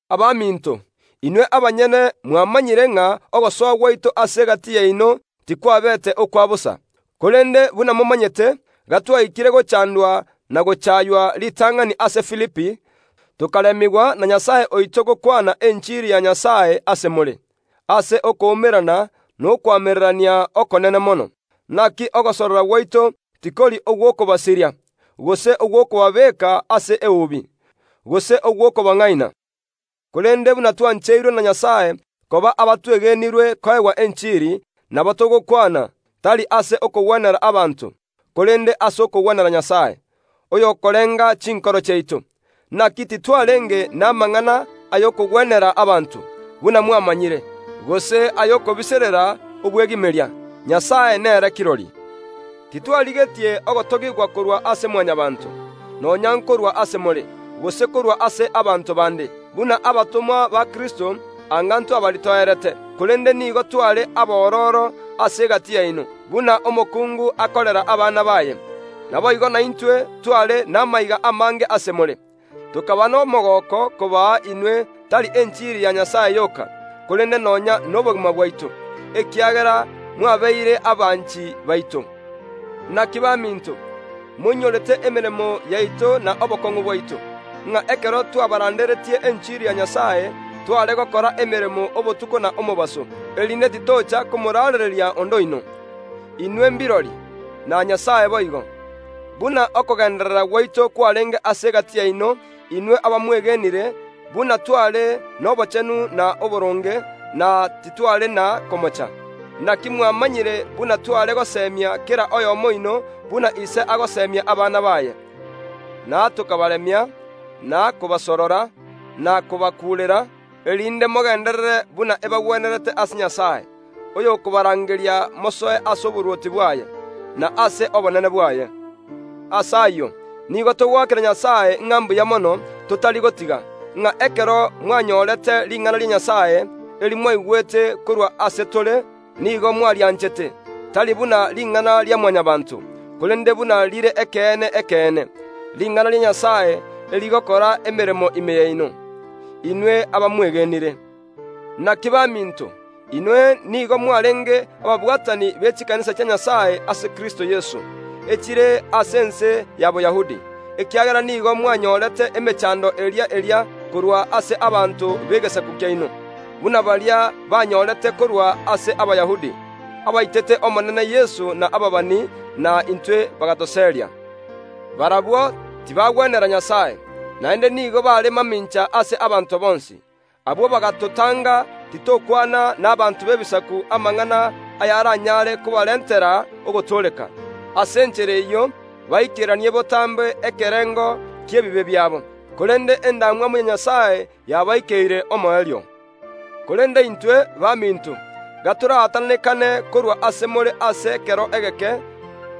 Abaminto, inwe abanyene mwamanyire ng’a ogosoa gwaito ase egati yaino tikwabeete okwa bosa. Korende, buna momanyete, gatwaikire gochandwa na gochaywa ritang’ani ase Filipi, tokaremigwa na Nyasae oito gokwana enchiri ya Nyasae ase more, ase okoumerana nokoamererania okonene mono. Naki ogosorora gwaito tikori ogw’okobasiria, gose ogw’okobabeka ase eubi, gose ogw’okobang’aina, korende buna twancheirwe na Nyasae koba abatwegenirwe koegwa enchiri, nabo togokwana, tari ase okogwenera abanto, korende ase okogwenera Nyasae, oyokorenga chinkoro chiaito. Naki titwarenge namang’ana ay’okogwenera abanto, buna mwamanyire, gose ay’okobiserera obwegimeria. Nyasae nere kirori. Titwarigetie ogotogigwa korwa ase Mwanyabaanto, nonya nkorwa ase more, gose korwa ase abanto bande. Buna abatomwa ba Kristo anga ntwabaritoerete, korende nigo tware abororo ase egati yaino, buna omokungu akorera abana baye. Naboigo naintwe tware namaiga amange ase more, tokaba nomogooko kobaa inwe, tari enchiri ya Nyasae yoka, korende nonya nobogima bwaito, ekiagera mwabeire abanchi baito. Naki baminto, moinyorete emeremo yaito na obokong’u bwaito, ng’a ekero twabaranderetie enchiri ya Nyasae, tware gokora emeremo obotuko na omobaso, erinde titocha komoraarereria onde oino. Inwe mbirori, na Nyasae boigo, buna okogenderera gwaito kwarenge ase egati yaino, inwe abamwegenire, buna tware nobochenu na oboronge, na titware na komocha. Naki mwamanyire buna tware gosemia kera oyomo oino buna ise agosemia abana baye, na tokabaremia, na kobasorora, na kobakuurera, erinde mogenderere buna ebagwenerete ase Nyasae, oyokobarangeria mosoe ase oborwoti bwaye, na ase obonene bwaye. Ase ayio, nigo togoakera Nyasae, ng’a mbuya mono, totari gotiga, ng’a ekero mwanyorete ring’ana ria Nyasae, eri mwaigwete korwa ase tore, nigo mwarianchete, tari buna ring’ana ria Mwanyabaanto, korende buna rire ekeene ekeene, ring’ana ria Nyasae, erigokora emeremo ime yaino, inwe abamwegenire. Naki baminto, inwe nigo mwarenge ababwatani be chikanisa chia Nyasae ase Kristo Yeso, echire ase ense ya Boyahudi, ekiagera nigo mwanyorete emechaando eria eria korwa ase abanto b’egesaku kiaino, buna baria banyorete korwa ase Abayahudi, abaitete Omonene Yeso na ababani, na intwe bagatoseria. Barabwo tibagwenera Nyasae, naende nigo bare mamincha ase abanto bonsi. Abwo bagatotanga titokwana nabaanto b’Ebisaku amang’ana ayaranyare kobarentera ogotooreka. Ase enchera eyio baikeranie botambe ekerengo ki’ebibe biabo. Korende endamwamu ya Nyasae yabaikeire omoerio. Korende intwe, baminto, gatoraatananekane korwa ase more ase ekero egeke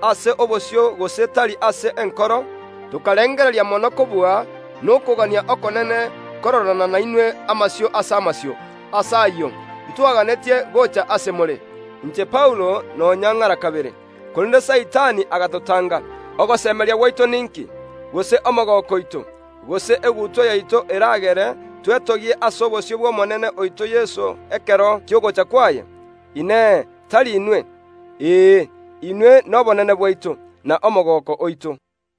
(ase obosio gose tari ase enkoro) tokarengereria mono kobua nokogania okonene kororana nainwe amasio ase amasio. Ase ayio, ntwaganetie gocha ase more (inche Paulo nonya ng’ara kabere) korende Saitani agatotanga. Ogosemeria gwaito ninki, gose omogooko oito, gose egutwa yaito eragere twetogie ase obosio bw’Omonene oito Yeso ekero ki’ogocha kwaye? Inee! Tari inwe? Ee, inwe nobonene bwaito, na omogooko oito.